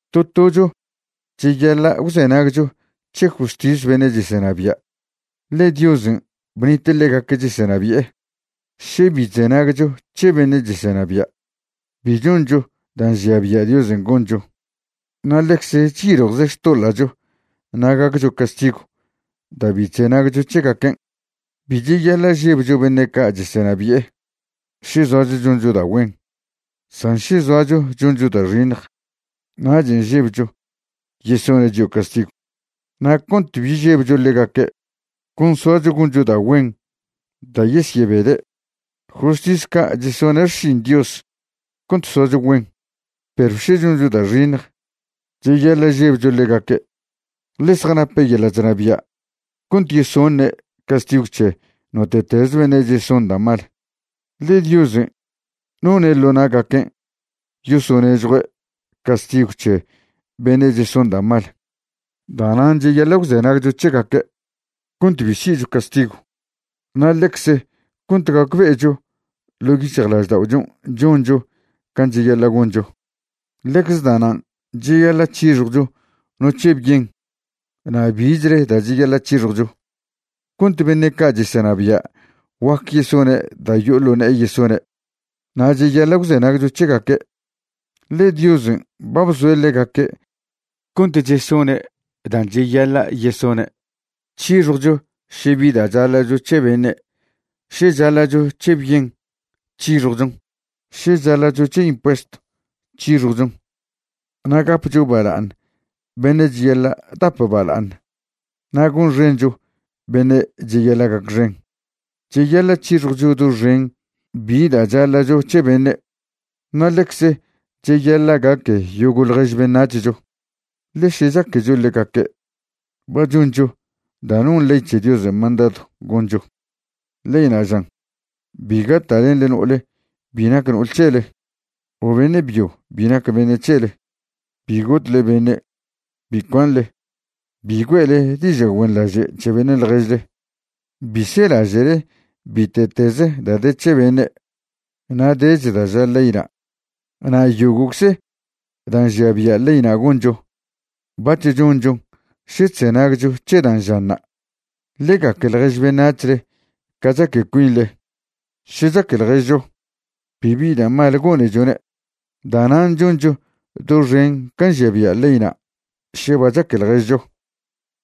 To tocho cheyaḻa' gwzenagcho c̱he justis beṉe' chesenabia', ḻe Diosen' bnite' ḻegaque' chesenabi'e. Še bi chzenagcho c̱he beṉe' chesenabia', bi choncho da' nžia bia' Diosen' goncho, na' ḻecze chyiljwze xtoḻa'cho na' gaccho castigw da' bi chzenagcho c̱hegaquen'. Bi cheyaḻa' žebcho beṉe' ca' chesenabi'e še zoacho choncho da' güen, san še zoacho choncho da' xiṉj, nachen' žebcho yesone' chio' castigw. Na' cont bi žebcho ḻegaque', con soacho goncho da' güen da' yesyebede'. Justis ca' chesone' xšin Dios cont soacho güen. Perw še choncho da' xiṉj, cheyaḻa' žebcho ḻegaque', ḻe zjanape' yeḻa' chnabia' cont yesoṉe' castigw c̱he note'teze beṉe' cheson da' mal, ḻe Diosen' none' ḻo na'gaquen' yosonežjue' castigw c̱he beṉe' cheson da' mal. Da'nan' cheyaḻa' gwzenagcho c̱hegaque' cont bi si'cho castigw na' ḻecze cont gacbe'echo ḻo' yic̱hjlažda'ochon' choncho can' cheyaḻa' goncho. Ḻecze da'nan' cheyaḻa' c̱hixjwcho no c̱he bien na' bichle da' cheyaḻa' c̱hixjwcho, cont beṉe' ca' chesenabia' guac yesone' da' yo'o ḻo ne'e yesone', na' cheyaḻa' gwzenagcho c̱hegaque', ḻe Diosen' ba bzoe' ḻegaque' cont chesone' dan' cheyaḻa' yesone'. C̱hixjwcho še bi da' chaḻa'cho c̱he beṉe'. Še chaḻa'cho c̱he bien, c̱hixjwchon. Še chaḻa'cho c̱he impuestw, c̱hixjwchon. Na' gapcho bala'aṉ beṉe' cheyaḻa' dap bala'aṉ. Na' gonxencho beṉe' cheyaḻa' gacxen. Cheyaḻa' c̱hixjwcho doxen bi da' chaḻa'cho c̱he beṉe', na' ḻecze cheyaḻa' gaque yogo' ḻjež beṉac̱hcho, ḻe še chaquecho ḻegaque', ba choncho da' non ley c̱he Diosen' mandadw goncho. Leyna' žan: “Bi gata'lenḻe no'ole bi nac no'ol c̱hele o beṉe' byo bi nac beṉe' c̱hele, bi gotle beṉe', bi cuanḻe, bi güe'le diža' güenḻaže' c̱he beṉe' ḻježle, bi selaže'le bite'teze da' de c̱he beṉe'.” Na' dech da' ža leyna'. Na' yogo'cze da' nžia bia' leyna' goncho, bac̱h chonchon še chzenagcho c̱he dan' žanṉa': “Ḻe gaque ḻjež beṉac̱hle ca chaque cuinḻe.” Še chaque ḻježcho, bibi da' mal gonechone'. Da'nan' choncho doxen can' nžia bia' leyna' še ba chaque ḻježcho.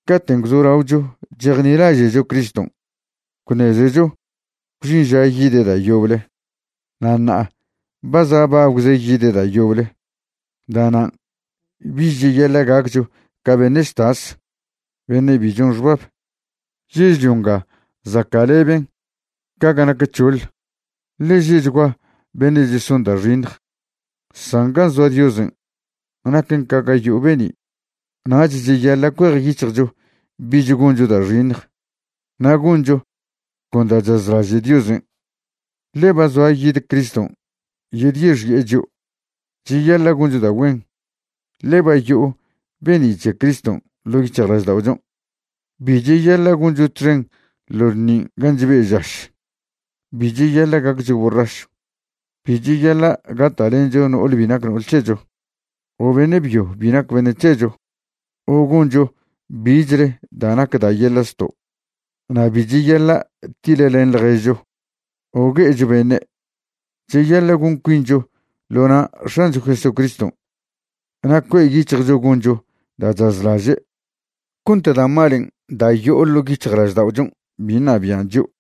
Caten' gwzolaocho chejnilaže'cho Criston' gwṉezecho gwžin ža yide' da' yoble. Na' ṉa'a ba za' bagwze yide' da' yoble. Da'nan' bich cheyaḻa' gaccho ca beṉe' chtas, beṉe' bi chon xbab. Yežlio nga zaca'leben ca ga nac c̱hoḻ, ḻe že'chgua beṉe' cheson da' xiṉj; san gan' zoa Diosen' naquen ca ga yo'o be'ni'. Nach cheyaḻa' cuejyic̱hjcho bich goncho da' xiṉj na' goncho con da' chazlaže' Diosen', ḻe ba zoa yide Criston' yedyexi'e chio'. Cheyaḻa' goncho da' güen, ḻe ba yo'o be'ni' c̱he Criston' ḻo' yic̱hjlažda'ochon'. Bi cheyaḻa' goncho txen ḻo ḻṉin' ga chbe' žaš, bi cheyaḻa' gaccho borrašw, bi cheyaḻa' gata'lencho no'ole bi nac no'ol c̱hecho o beṉe' byo bi nac beṉe' c̱hecho o goncho bichle da' nac da' yeḻa' zto', na' bi cheyaḻa' tiḻlen ḻježcho o gue'echo beṉe'. Cheyaḻa' gon cuincho ḻo na' X̱ancho Jesucriston' na' cue' yic̱hjcho goncho da' chazlaže' cont da' malen' da' yo'o ḻo' yic̱hjlažda'ochon' bi ṉabian' chio'.